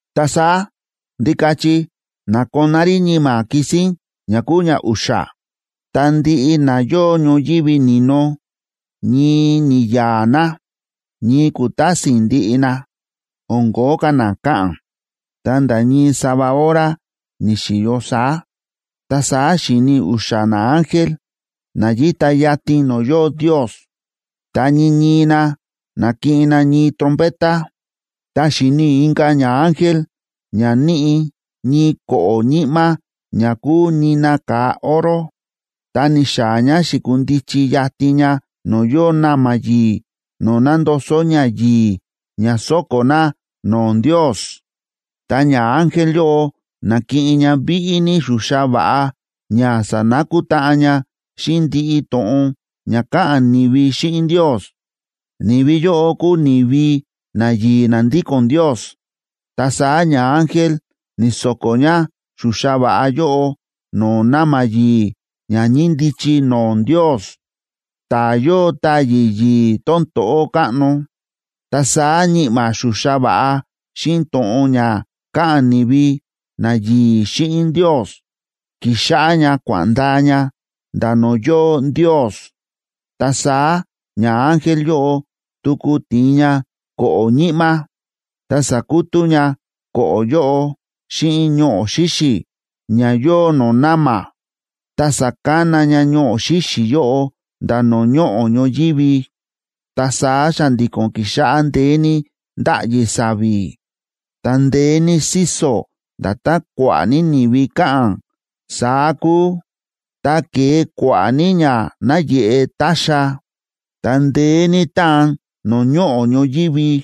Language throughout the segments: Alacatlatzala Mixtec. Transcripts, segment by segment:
Ta saá Ndikachi na̱koná rí ñi̱ma̱ kisín ña kúu ñau̱xa̱, ta ndiꞌi na yóo ñoyívi ni̱no ñii ni̱ya̱a̱ na, ñii ku̱tásin ndiꞌi na, o̱n ko̱ó ka̱ na káꞌa̱n, ta̱nda̱ ñii sava hora ni̱xi̱yo saá. Ta saá xi̱ni i̱ u̱xa̱ naángel na yíta yatin no̱o̱ yóo Ndios, ta ñii ñii na na̱kiꞌin na ñii trompeta. Ta xi̱ni i̱ inka̱ ñaángel ña níꞌi ñii ko̱ꞌo̱ ñi̱ꞌma̱ ña kúu nina ka̱a oro, ta ni̱xaa̱ ña, xi̱kundichi yatin ña no̱o̱ yóo na̱ma̱ yi̱i̱ no̱o̱ nándoso ñayi̱i̱ ña sóko̱ na no̱o̱ Ndios. Ta ñaángel yóꞌo na̱kiꞌin ña víꞌí ní xuxa va̱ꞌa ña sanakutáꞌan ña xíꞌin ndiꞌi to̱ꞌon ña káꞌa̱n ni̱vi xíꞌin Ndios. Ni̱vi yóꞌo kúu ni̱vi nayi̱i̱ na ndíko̱n Ndios. Ta saá ñaángel ni̱so̱ko̱ ña xuxa va̱ꞌa yóꞌo no̱o̱ na̱ma̱ yi̱i̱ ña ñíndichi no̱o̱ Ndios, ta̱ yóo táyi̱ yi̱i̱ tón to̱ꞌó káꞌno. Ta saá ñi̱ꞌma̱ xuxa va̱ꞌa xíꞌin to̱ꞌon ña káꞌa̱n ni̱vi nayi̱i̱ xíꞌin Ndios, ki̱xáꞌá ñá kua̱ꞌa̱n ndaa ña nda̱ no̱o̱ yóo Ndios. Ta saá ñaángel yóꞌo tuku ti̱in ña ko̱ꞌo̱ ñi̱ꞌma̱, ta sa̱kutú ña ko̱ꞌo̱ yóꞌo xíꞌin ñoꞌo̱ xíxi̱ ña yóo no̱o̱ na̱ma̱, ta sa̱kana ña ñoꞌo̱ xíxi̱ yóꞌo nda̱ no̱o̱ ñoꞌo̱ ñoyívi. Ta saá xa̱ndi̱ko̱n ki̱xáꞌá ndeé ní ndáꞌyi sa̱vi̱, ta ndeé ní síso̱, nda̱tán kua̱ꞌa̱ ní ni̱vi káꞌa̱n, saá kúu. Ta ke̱e kua̱ꞌa̱ ní ña náyeꞌe ta̱xa̱, ta ndeé ní táan no̱o̱ ñoꞌo̱ ñoyívi.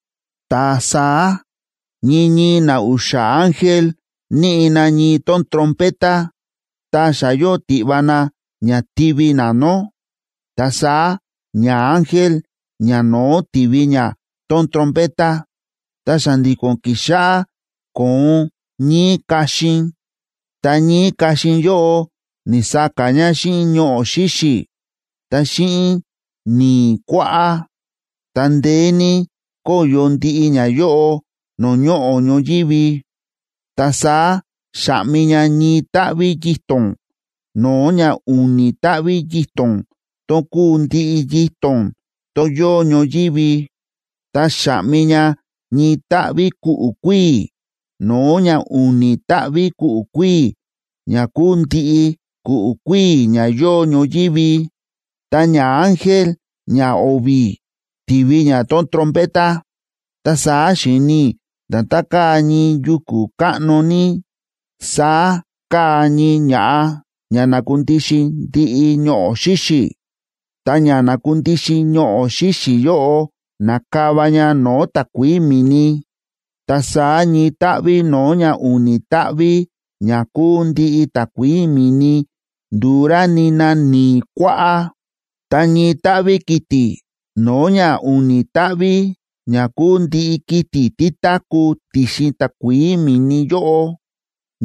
Ta saá ñii ñii na u̱xa̱ ángel níꞌi na ñii tón trompeta, ta xa yóo tiꞌva na ña tivi na nó. Ta saá ñaángel ñano̱ó ti̱vi ña tón trompeta, ta xa̱ndi̱ko̱n ki̱xáꞌá kóon ñíí kaxin, ta ñíí kaxin yóꞌo ni̱sa̱ka̱ ña xíꞌin ñoꞌo̱ xíxi̱, ta xíꞌin ni̱i̱ kuáꞌá. Ta ndeé ní kóyo ndiꞌi ñayóꞌo no̱o̱ ñoꞌo̱ ñoyívi. Ta saá xa̱ꞌmi ña ñii táꞌví yito̱n no̱o̱ ña u̱ni̱ táꞌví yito̱n tón kúu ndiꞌi yito̱n tón yóo ñoyívi. Ta xa̱ꞌmi ña ñii táꞌví ku̱ꞌu̱ kuíi̱ no̱o̱ ña u̱ni̱ táꞌví ku̱ꞌu̱ kuíi̱, ña kúu ndiꞌi ku̱ꞌu̱ kuíi̱ ña yóo ñoyívi. Ta ñaángel ñao̱vi̱ ti̱vi ña tón trompeta, ta saá xi̱ni i̱ nda̱tán káa ñii yuku̱ káꞌno ní, saá káa ñii ña̱ꞌa ña nákundixin ndiꞌi ñoꞌo̱ xíxi̱. Ta ña nákundixin ñoꞌo̱ xíxi̱ yóꞌo na̱kava ña no̱o̱ takuií mi̱ni. Ta saá ñii táꞌví no̱o̱ ña u̱ni̱ táꞌví ña kúu ndiꞌi takuií mi̱ni ndu̱u rá nina ni̱i̱ kuáꞌá. Ta ñii táꞌví kiti̱ no̱o̱ ña u̱ni̱ táꞌví ña kúu ndiꞌi kiti̱ tí táku̱ ti̱xin takuií mi̱ni yóꞌo,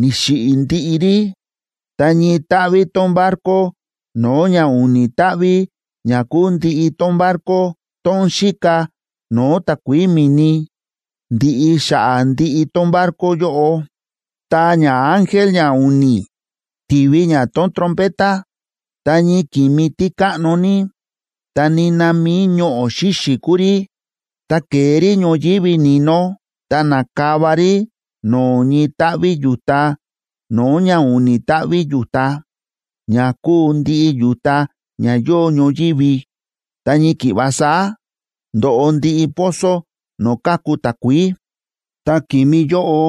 ni̱xiꞌi̱ ndiꞌi rí, ta ñii táꞌví tón barco no̱o̱ ña u̱ni̱ táꞌví ña kúu ndiꞌi tón barco tón xíka no̱o̱ takuií mi̱ni, ndi̱ꞌi xa̱ꞌa̱ ndiꞌi tón barco yóꞌo. Ta ñaángel ñau̱ni̱ ti̱vi ña tón trompeta, ta ñii ki̱mi tí káꞌno ní, ta nina mi̱i ñoꞌo̱ xíxi̱ kúu rí, ta ke̱e rí ñoyívi ni̱no ta na̱kava rí no̱o̱ ñii táꞌví yu̱ta no̱o̱ ña u̱ni̱ táꞌví yu̱ta, ña kúu ndiꞌi yu̱ta ña yóo ñoyívi. Ta ñii ki̱ꞌva saá ndo̱ꞌo ndiꞌi pozo no̱o̱ káku takuií. Ta ki̱mi yóꞌo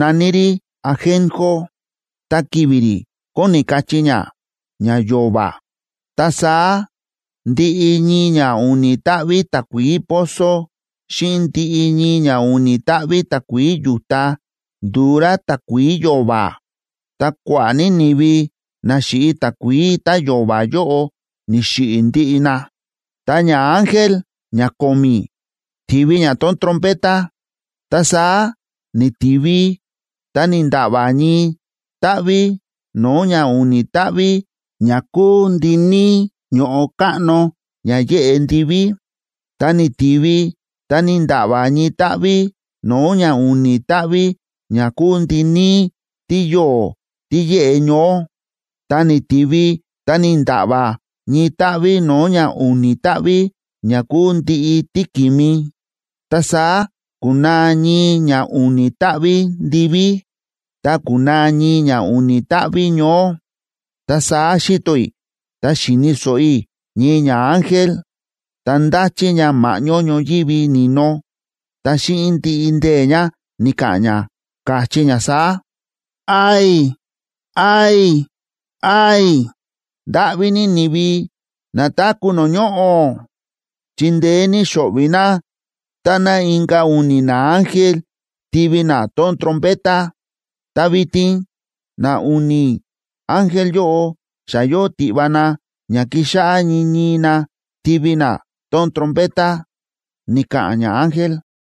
na̱ní rí Ajenjo, ta ki̱vi̱ rí kóni kachí ña: ña yo̱va̱. Ta saá ndiꞌi ñii ña u̱ni̱ táꞌví takuií pozo xíꞌin ndiꞌi ñii ña u̱ni̱ táꞌví takuií yu̱ta, ndu̱u rá takuií yo̱va̱. Ta kua̱ꞌa̱ ní ni̱vi na xi̱ꞌi takuií tá yo̱va̱ yóꞌo ni̱xiꞌi̱ ndiꞌi na. Ta ñaángel ñako̱mi̱ ti̱vi ña tón trompeta, ta saá ni̱tiví ta ni̱nda̱ꞌva̱ ñii táꞌví no̱o̱ ña u̱ni̱ táꞌví ña kúu ndiníí ño̱ꞌo káꞌno ña yéꞌe ndiví. Ta ni̱tiví ta ni̱nda̱ꞌva̱ ñii táꞌví no̱o̱ ña u̱ni̱ táꞌví ña kúu ndiníí tíyo̱o̱ tí yéꞌe ñoó. Ta ni̱tiví ta ni̱nda̱ꞌva̱ ñii táꞌví no̱o̱ ña u̱ni̱ táꞌví ña kúu ndiꞌi tíki̱mi. Ta saá ku̱naa ñii ña u̱ni̱ táꞌví ndiví, ta ku̱naa ñii ña u̱ni̱ táꞌví ñoó. Ta saá xi̱to i̱, ta xi̱ni̱ so̱ꞌo i̱ ñii ñaángel, ta ndáchí ña ma̱ꞌñó ñoyívi ni̱no, ta xíꞌin ndiꞌi ndee̱ ña, ni̱ka̱ꞌa̱n ña, káchí ña saá: ―¡Ay! ¡Ay! ¡Ay! Ndáꞌví ní ni̱vi na táku̱ no̱o̱ ñoꞌo̱, chi ndeé ní xo̱ꞌvi̱ na táná inka̱ u̱ni̱ naángel tivi na tón trompeta. Ta vitin na u̱ni̱ ángel yóꞌo xa yóo tiꞌva na ña kixáꞌá ñii ñii na tivi na tón trompeta ―ni̱ka̱ꞌa̱n ñaángel.